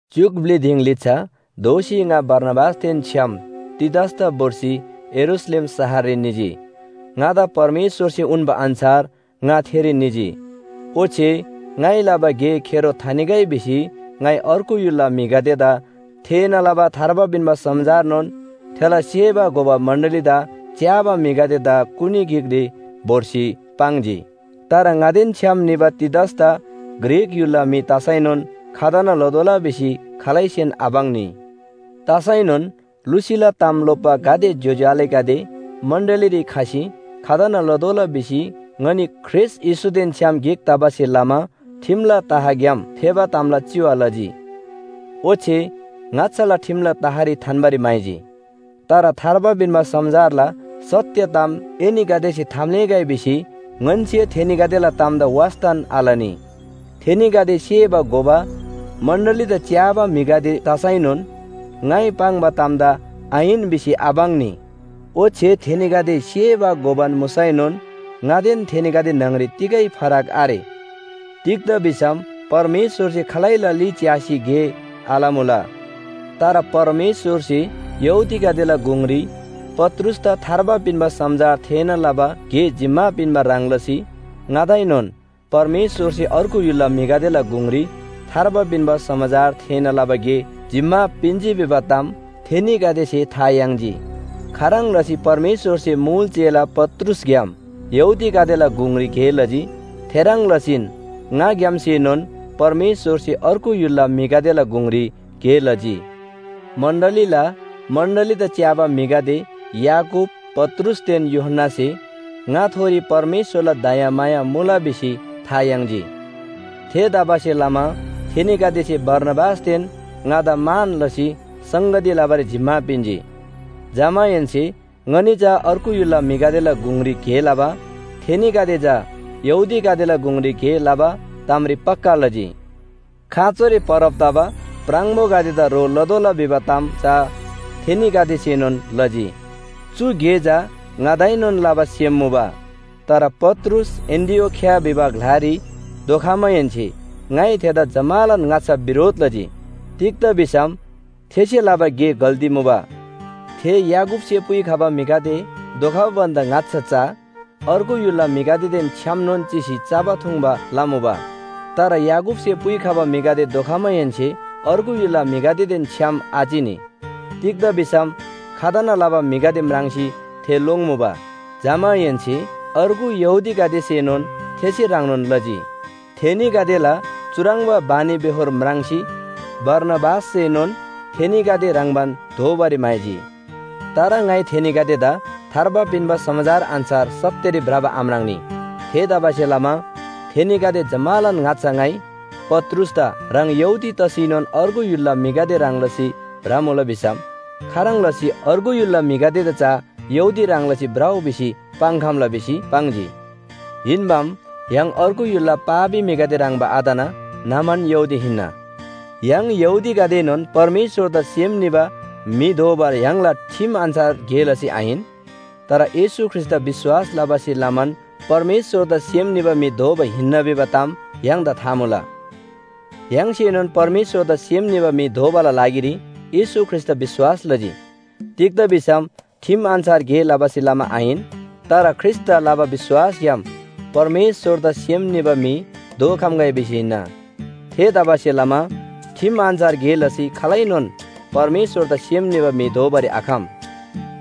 च्‍युक ब्‍लि दिङ लिच्‍छा दोःसी ङा बारनाबासदेन छ्‌याम तीतसदा भोर्सी यरूशलेम शहररी निजी। ङादा परमेश्‍वरसे उन्‍बा अन्‍छार ङा थेरी निजी। ओच्‍छे ङाइ लबा गे खेरो थानिगै भिसी ङाइ अर्गु य्‍हुलला म्‍हिगदेदा थेःना लबा थार्बा पिन्‍बा समाचारनोन थेला सेबा घोबा मण्‍डलीदा च्‍याबा म्‍हिगदेदा कुनी गिकरी भोर्सी पाङ्जी। तर ङादेन छ्‌याम निबा तीतसदा ग्रीक य्‍हुलला म्‍हि तसैनोन खतना लतोःला भिसी खालैसेन आपाङ्नी। तसैनोन लुसीला ताम लोप्‍बा गाते ज्‍योज्‍यो आलेगदे मण्‍डलीरी खसी खतना लतोःला भिसी ङनी ख्रीष्‍ट येशूदेन छ्‌याम गिक तबासे लमा ठिमला तहग्‍याम फेबा तामला चिवा लजी। ओच्‍छे ङाच्‍छाला ठिमला तहरी थान्‍बारी म्‍हाइजी। तर थार्बा पिन्‍बा समाचारला सत्‍य ताम एनीगदेसे थाम्‍लेःगै भिसी ङन्‍से थेनीगदेला तामदा वास्‍तान आलनी। थेनीगदे सेबा घोबा मण्‍डलीदा च्‍याबा म्‍हिगदे तसैनोन ङाइ पाङ्बा तामदा आहिन भिसी आपाङ्नी। ओच्‍छे थेनीगदे सेबा घोबान मुसैनोन ङादेन थेनीगदे न्‍हङरी तिगै फरक आरे। तिग्‍दा भिसम परमेश्‍वरसे खालैला ली च्‍यासी गे आलमुला। तर परमेश्‍वरसे यहूदीगदेला गुङरी पत्रुसदा थार्बा पिन्‍बा समाचार थेःना लबा गे जिम्‍मा पिन्‍बा ह्रङ् लसी ङादाएनोन परमेश्‍वरसे अर्गु य्‍हुलला म्‍हिगदेला गुङरी थार्बा पिन्‍बा समाचार थेःना लबा गे जिम्‍मा पिन्‍जी भिबा ताम थेनीगदेसे था याङ्जी। खाह्रङ् लसी परमेश्‍वरसे मुल चेला पत्रुसग्‍याम यहूदीगदेला गुङरी गे लजी थेह्रङ् लसीन ङाग्‍यामसेनोन परमेश्‍वरसे अर्गु य्‍हुलला म्‍हिगदेला गुङरी गे लजी। मण्‍डलीला मण्‍डलीदा च्‍याबा म्‍हिगदे याकूब, पत्रुसदेन यूहन्‍नासे ङाथोरी परमेश्‍वरला दयामाया मुला भिसी था याङ्जी। थेतबासेलमा थेनीगदेसे बारनाबासदेन ङादा मान लसी संगती लबारी जिम्‍मा पिन्‍जी। जमाहेन्‍से ङनी चा अर्गु य्‍हुलला म्‍हिगदेला गुङरी गे लबा थेनीगदे चा यहूदीगदेला गुङरी गे लबा तामरी पक्‍का लजी। खाँचोरी परब तबा प्राङबोगदेदा ह्रो लतोःला भिबा ताम चा थेनीगदेसेनोन लजी। चु गे चा ङादाएनोन लबा सेम मुबा। तर पत्रुस एन्‍टिओखिया भिबा ग्‍लारी धोखमाहेन्‍से ङाइ थेदा जम्‍मालान ङाच्‍छा बिरोध लजी। तिग्‍दा भिसम थेसे लबा गे गल्‍ती मुबा। थे याकूबसे पुइखबा म्‍हिगदे धोखबा भन्‍दा ङाच्‍छा चा अर्गु य्‍हुलला म्‍हिगदेदेन छ्‌यामनोन चिसी चबा थुङ्बा लमुबा। तर याकूबसे पुइखबा म्‍हिगदे धोखमाहेन्‍से अर्गु य्‍हुलला म्‍हिगदेदेन छ्‌याम आचिनी। तिग्‍दा भिसम खतना लबा म्‍हिगदे म्राङ्सी थे लोङ्मुबा। जमाहेन्‍से अर्गु यहूदीगदेसेनोन थेसे ह्रङ्नोन लजी। थेनीगदेला चुह्रङ्बा बानीबेहोर म्राङ्सी बारनाबासएनोन थेनीगदे ह्रङ्‌बान दोबारी म्‍हाइजी। तर ङाइ थेनीगदेदा थार्बा पिन्‍बा समाचार अन्‍छार सत्‍यरी भ्रबा आम्राङ्‌नी। थेतबासेलमा थेनीगदे जम्‍मालान ङाच्‍छा ङाइ पत्रुसदा “ह्राङ यहूदी तसीनोन अर्गु य्‍हुलला म्‍हिगदे ह्रङ् लसी भ्रमुला भिसम खाह्रङ् लसी अर्गु य्‍हुलला म्‍हिगदेदा चा यहूदी ह्रङ् लसी भ्रउ भिसी पाङ्‌खम्‍ला” भिसी पाङ्जी। हिन्‍बाम य्‍हाङ अर्गु य्‍हुलला पापी म्‍हिगदे ह्रङ्‌बा आतना न्‍हमान यहूदी हिन्‍ना। य्‍हाङ यहूदीगदेएनोन परमेश्‍वरदा सेम निबा म्‍हि दोबा य्‍हाङला ठिम अन्‍छार गे लसी आहिन। तर येशू ख्रीष्‍टदा विश्‍वास लबासे लमान परमेश्‍वरदा सेम निबा म्‍हि दोबा हिन्‍ना भिबा ताम य्‍हाङदा था मुला। य्‍हाङसेनोन परमेश्‍वरदा सेम निबा म्‍हि दोबाला लागिरी येशू ख्रीष्‍टदा विश्‍वास लजी। तिग्‍दा भिसम ठिम अन्‍छार गे लबासे लमा आहिन, तर ख्रीष्‍टदा लबा विश्‍वासग्‍याम परमेश्‍वरदा सेम निबा म्‍हि दोखम्‍गै भिसी हिन्‍ना। थेतबासेलमा ठिम अन्‍छार गे लसी खालैनोन परमेश्‍वरदा सेम निबा म्‍हि दोबारी आखम।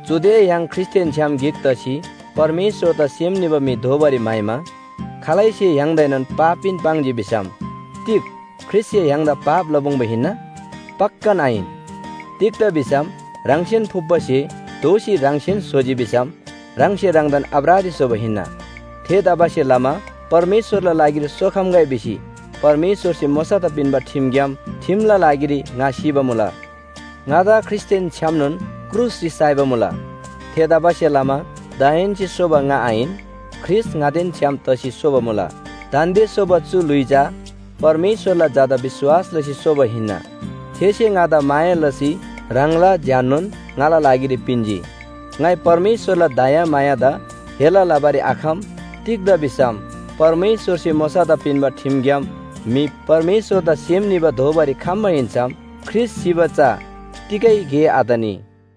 चुदे य्‍हाङ ख्रीष्‍टदेन छ्‌याम गिक तसी परमेश्‍वरदा सेम निबा म्‍हि दोबारी म्‍हाइमा खालैसे य्‍हाङदाएनोन पापीन पाङ्जी भिसम तिग ख्रीष्‍टसे य्‍हाङदा पाप लपुङ्बा हिन्‍ना? पक्‍कान आहिन। तिग्‍दा भिसम ह्राङसेन फुप्‍बा स्‍हे दोःसी ह्राङसेन स्‍होजी भिसम ह्राङसे ह्राङदान अपराधी स्‍होबा हिन्‍ना। थेतबासेलमा परमेश्‍वरला लागिरी सोखम्‍गै भिसी परमेश्‍वरसे मोशादा पिन्‍बा ठिमग्‍याम ठिमला लागिरी ङा सिबा मुला। ङादा ख्रीष्‍टदेन छ्‌यामनोन क्रुसरी साइबा मुला। थेतबासेलमा दाहेन्‍से सोबा ङा आहिन, ख्रीष्‍ट ङादेन छ्‌याम तसी सोबा मुला। दान्‍दे सोबा चु ल्‍हुइ चा परमेश्‍वरला झादा विश्‍वास लसी सोबा हिन्‍ना। थेसे ङादा माया लसी ह्राङला ज्‍याननोन ङाला लागिरी पिन्‍जी। ङाइ परमेश्‍वरला दयामायादा हेला लबारी आखम। तिग्‍दा भिसम परमेश्‍वरसे मोशादा पिन्‍बा ठिमग्‍याम म्‍हि परमेश्‍वरदा सेम निबा दोबारी खम्‍बा हिन्‍सम ख्रीष्‍ट सिबा चा तिगै गे आतनी।